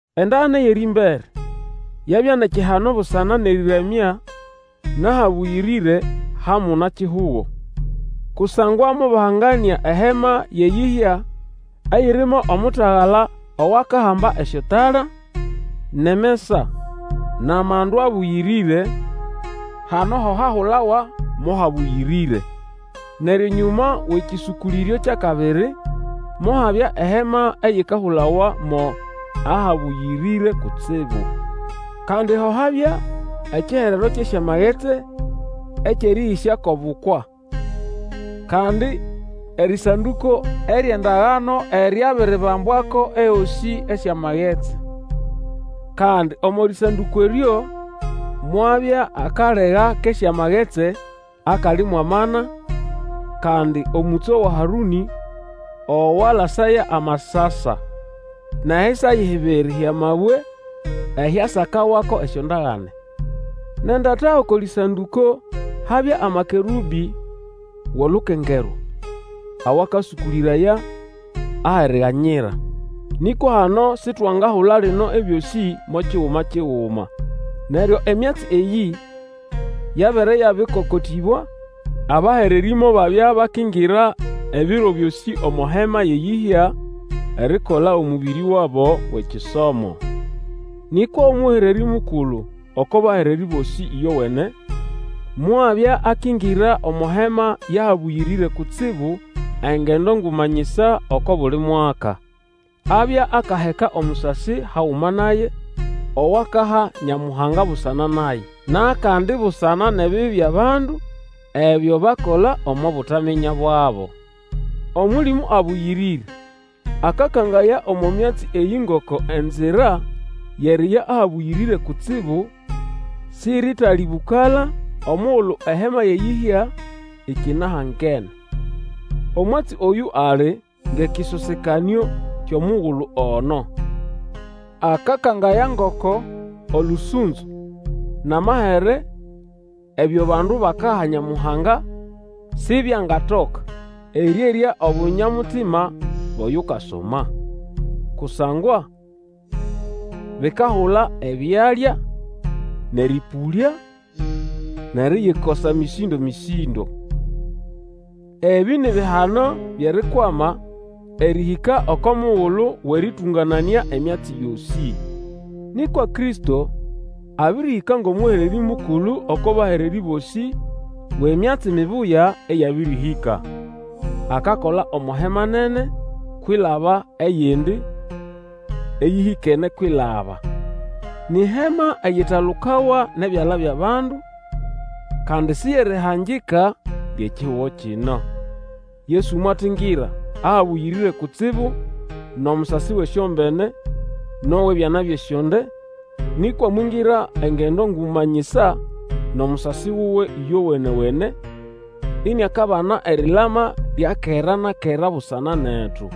Endagane yʼerĩmbere yabya nʼekihano busana nʼerĩramya nʼahabũyĩrĩre ha muna-kihugo. Kusangwa mobahanganĩa eHema yʼeyĩhya eyirimo omutagala owakahamba esyotala, nʼemesa, nʼamandu abũyĩrĩre; hano ho hahulawa mo Habũyĩrĩre. Neryo enyũma wʼekĩsũkũlĩryo kyʼakabiri, mohabya eHema eyikahulawa mo Ahabũyĩrĩre Kutsibu. Kandi ho habya ekiherero kyʼesyamagetsi ekyʼerĩhĩsya kwʼobukwa, kandi erĩsandũko eryʼendagano eryabiribambwako ehosĩ esyamagetsi. Kandi omo rĩsandũko eryo mwabya akalega kʼesyamagetsi akali mwʼamana, kandi omũtso wa Harũnĩ owalasaya amasasa, nʼehisayi hibiri hyʼamabwe ehyasakawako esyondagane. Nʼendata oko lĩsandũko habya amakerũbĩ wʼolukengerwa, awakasũkũlĩraya Aheriganyira. Nĩkwa hano sitwangahula lino ebyosĩ mo kiguma kiguma. Neryo emyatsi eyĩ yabere yabĩkokotĩbwa, abahererĩ mobabya bakingira ebiro byosĩ omo hema yʼeyĩhya erikola omũbĩrĩ wabo wʼekisomo. Nĩkwa Omũhererĩ Mukulu oko bahererĩ bosĩ ĩyowene mwabya akingira omo Hema yʼAhabũyĩrĩre Kutsibu engendo nguma nyisa oko buli mwaka. Abya akaheka omusasi haguma naye, owakaha Nyamuhanga busana naye, nʼakandi busana nʼebibi byʼabandu, ebyo bakola omo butaminya bwabo. Omũlĩmũ Abũyĩrĩre akakangaya omo myatsi eyĩ ngoko enzira yʼeriya Ahabũyĩrĩre Kutsibu siritalĩbũkala omugulu ehema yʼeyĩhya ikinahangene. Omwatsi oyũ ali ngʼekĩsosekanĩo kyʼomugulu ono. Akakangaya ngoko olũsũnzo nʼamahere ebyo abandu bakaha Nyamuhanga sibyangatoka erĩerya obunya-mutima bwʼoyukasoma. Kusangwa bikahula ebyalya, nʼerĩpũlya nʼeriyikosa mĩsĩndo-mĩsĩndo. Ebĩ ni bihano byʼerikwama erĩhĩka oko mugulu wʼerĩtũngananĩa emyatsi yosĩ. Nĩkwa Kristo abĩrĩhĩka ngʼomũhererĩ Mukulu oko bahererĩ bosĩ wʼemyatsi mibuya eyabĩrĩhĩka. Akakola omo Hema nene kwilaba eyindi, eyĩhĩkene kwilaba. Ni Hema eyitalukawa nʼebyala byʼabandu, kandi si yʼerihangika lyʼekihugo kino. Yesu mwatingira Ahabũyĩrĩre Kutsibu nʼomusasi wʼesyombene nʼowʼebyana byʼesyonde, nĩkwa mwingira engendo nguma nyisa nʼomusasi wuwe ĩyowene-wene, iniakabana erilama lya kera na kera busana netu.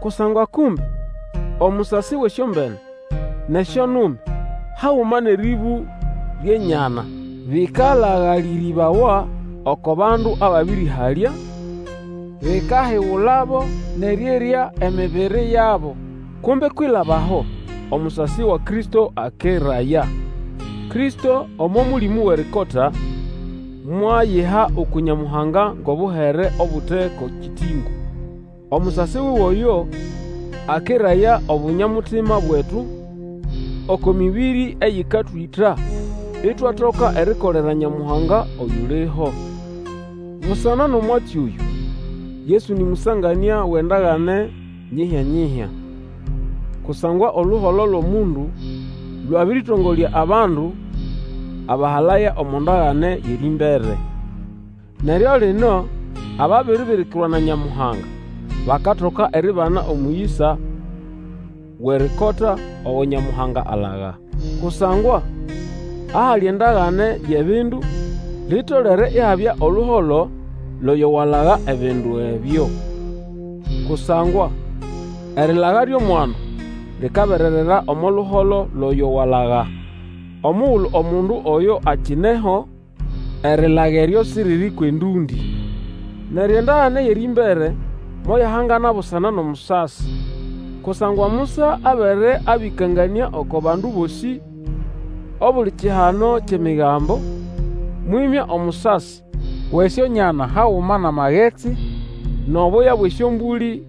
Kusangwa kumbe omusasi wʼesyombene, nʼesyonume, haguma nʼerĩbũ lyʼenyana bĩkalagalĩrĩbawa oko bandu ababĩrĩhalya, bikahigulabo nʼerĩerya emibiri yabo, kumbe kwilaba aho, omusasi wa Kristo akeraya. Kristo omo Mũlĩmũ Wʼerikota mwayiha uku Nyamuhanga ngʼobuhere obute ko kĩtĩngũ. Omusasi wuwe oyo, akeraya obunyamutima bwetu oko mĩbĩrĩ eyĩkatwĩta, itwatoka erikolera Nyamuhanga oyuliho. Busana nʼomwatsi oyũ, Yesu nĩ mũsanganĩa wʼendagane nyihya-nyihya. Kusangwa oluholo lwʼomundu lwabĩrĩtongolya abandu abahalaya omo ndagane yʼerĩmbere. Neryo lino ababiribirikirwa na Nyamuhanga bakatoka eribana omũyĩsa Wʼerikota ogo Nyamuhanga alaga. Kusangwa ahali endagane yʼebindu, litolere ihabya oluholo lwʼoyo walaga ebindu ebyo. Kusangwa erilaga lyʼomwandu likabererera omo luholo lwʼoyo walaga. Omugulu omundu oyo akineho, erilaga eryo siriri kwʼendũndĩ. Neryo endagane yʼerĩmbere moyahangana busana nʼomusasi Kusangwa Musa, abere abĩkanganĩa oko bandu bosĩ obuli kihano kyʼEmigambo, mwĩmya omusasi wʼesyonyana haguma nʼamagetsi, nʼobweya bwʼesyombũlĩ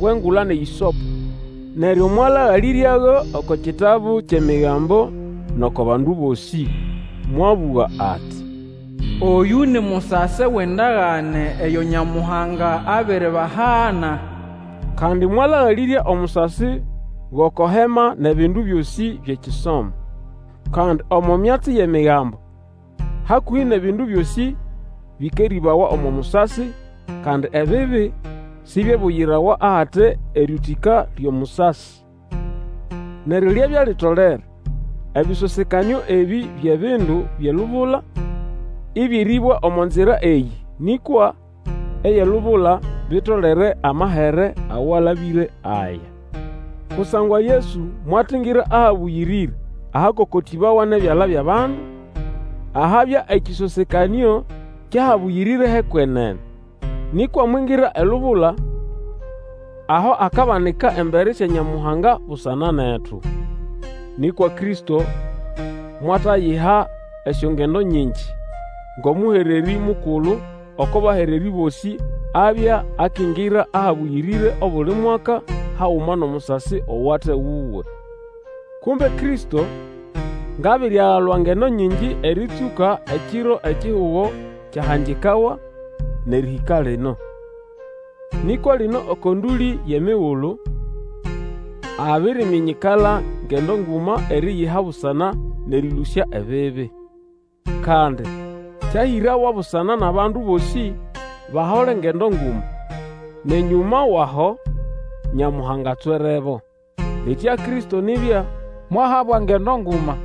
bwʼengula nʼehĩsopo, neryo mwalagalĩryago oko kitabu kyʼEmigambo nʼoko bandu bosĩ. Mwabũga ati, Oyũ ni musasi wʼendagane eyo Nyamuhanga abiribahana. Kandi mwalagalĩrya omusasi gʼoko Hema nʼebindu byosĩ byʼekisomo. Kandi omo myatsi yʼEmigambo, hakũhĩ nʼebindu byosĩ, bĩkerĩbawa omo musasi, kandi ebibi sibyebuyirawa ahate erĩũtĩka lyʼomusasi. Neryo lyabya litolere ebĩsosekanĩo ebĩ byʼebindu byʼelubula, ĩbyerĩbwa omo nzira eyĩ, nĩkwa ebyʼelubula bitolere amahere awalabĩre aya. Kusangwa Yesu mwatingira Ahabũyĩrĩre ahakokotĩbawa nʼebyala byʼabandu, ahabya ekĩsosekanĩo kyʼAhabũyĩrĩre hʼekwenene, nĩkwa mwingira elubula aho akabanika embere sya Nyamuhanga busana netu. Nĩkwa Kristo mwatayiha esyongendo nyingi. Ngʼomũhererĩ Mukulu oko bahererĩ bosĩ abya akingira Ahabũyĩrĩre obuli mwaka haguma nʼomusasi owate wuwe. Kumbe Kristo ngʼabiriagalwa ngendo nyingi erĩtsũka ekiro ekihugo kyahangikawa nʼerĩhĩka lino. Nĩkwa lino oko ndũlĩ yʼemigulu, abiriminyikala ngendo nguma eriyiha busana nʼerĩlũsya ebibi. Kandi kyahĩrawa busana nʼabandu bosĩ bahole ngendo nguma, nʼenyũma wʼaho Nyamuhanga atswerebo. Litya Kristo nibya mwahabwa ngendo nguma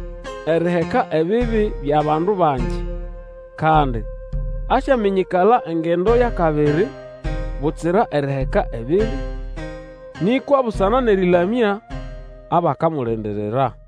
eriheka ebibi byʼabandu bangi. Kandi asyaminyikala engendo yʼakabiri butsira eriheka ebibi, nĩkwa busana nʼerĩlamya abakamulindirira.